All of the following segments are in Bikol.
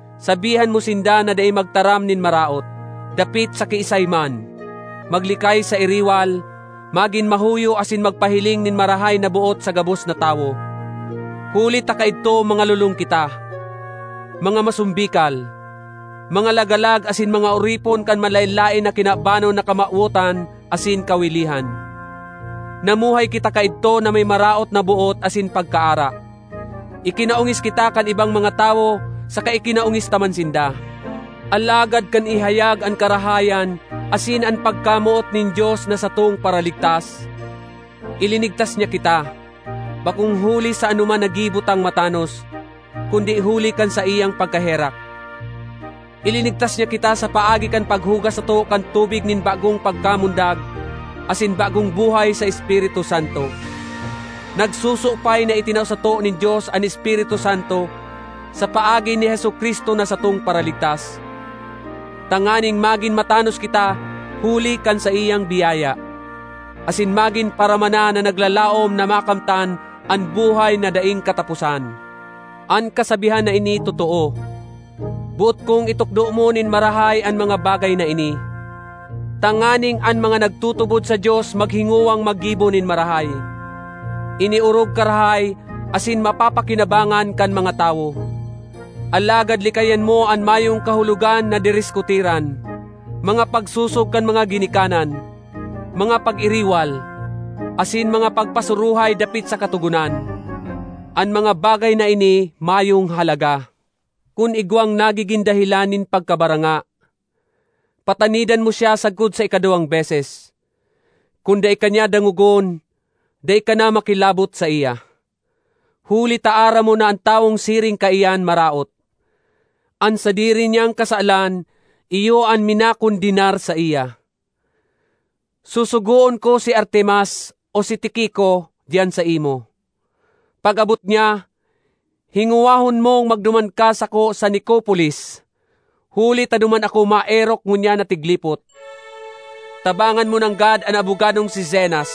Sabihan mo sinda na dai magtaram nin maraot, dapit sa kiisay man, maglikay sa iriwal, magin mahuyo asin magpahiling nin marahay na boot sa gabos na tawo. Huli ta kaidto mga lolong kita, mga masombikal, mga lagalag asin mga oripon kan manlaen-laen na kinabanon na kamawotan asin kawilihan. Namuhay kita kaidto na may maraot na boot asin pagkaara; ikinaongis kita kan ibang mga tawo saka ikinaongis ta man sinda. Alagad kan ihayag an karahayan asin an pagkamoot nin Dios na satong Paraligtas, ilinigtas niya kita, bakong huli sa anoman na gibo tang matanos, kundi huli kan saiyang pagkaherak. Ilinigtas niya kita sa paagi kan paghugas sato kan tubig nin bagong pagkamundag asin bagong buhay sa Espiritu Santo. Nagsusupay na itinao sato nin Dios an Espiritu Santo sa paagi ni Jesu-Cristo na satong Paraligtas, tanganing magin matanos kita huli kan saiyang biyaya, asin magin paramana na naglalaom na makamtan an buhay na daing kataposan. An kasabihan na ini totoo. Boot kong itukdo mo nin marahay an mga bagay na ini, tanganing an mga nagtutubod sa Dios maghingowang maggibo nin marahay; ini orog karahay asin mapapakinabangan kan mga tawo. Alagad likayan mo an mayong kahulogan na diriskutiran, mga pagsosog kan mga ginikanan, mga pag-iriwal, asin mga pagpasuruhay dapit sa katogonan. An mga bagay na ini mayong halaga. Kun igwang nagigin dahelan nin pagkabaranga, patanidan mo siya sagkod sa ikaduwang beses; kun dai ka niya dangogon, dai ka na makilabot saiya. Huli ta aram mo na an tawong siring kaiyan maraot; an sadiri niyang kasalan iyo an minakondenar saiya. Susugoon ko si Artemas o si Tiquico diyan saimo. Pag-abot niya, hingowahon mong magduman ka sako sa Nicopolis, huli ta duman ako maerok ngunyan na tiglipot. Tabangan mo nanggad an abogadong si Zenas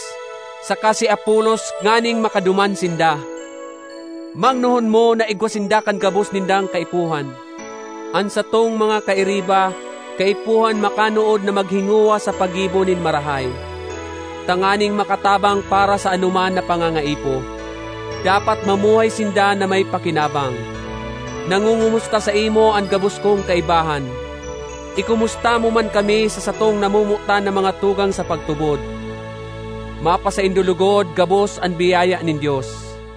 saka si Apolos nganing makaduman sinda; mangnohon mo na igwa sinda kan gabos nindang kaipuhan. An satong mga kairiba kaipuhan makanood na maghingowa sa paggibo nin marahay, tanganing makatabang para sa anoman na pangangaipo; dapat mamuhay sinda na may pakinabang. Nangongomusta saimo an gabos kong kaibahan. Ikomusta mo man kami sa satong namomotan na mga tugang sa pagtubod. Mapasaindo logod gabos an biyaya nin Dios.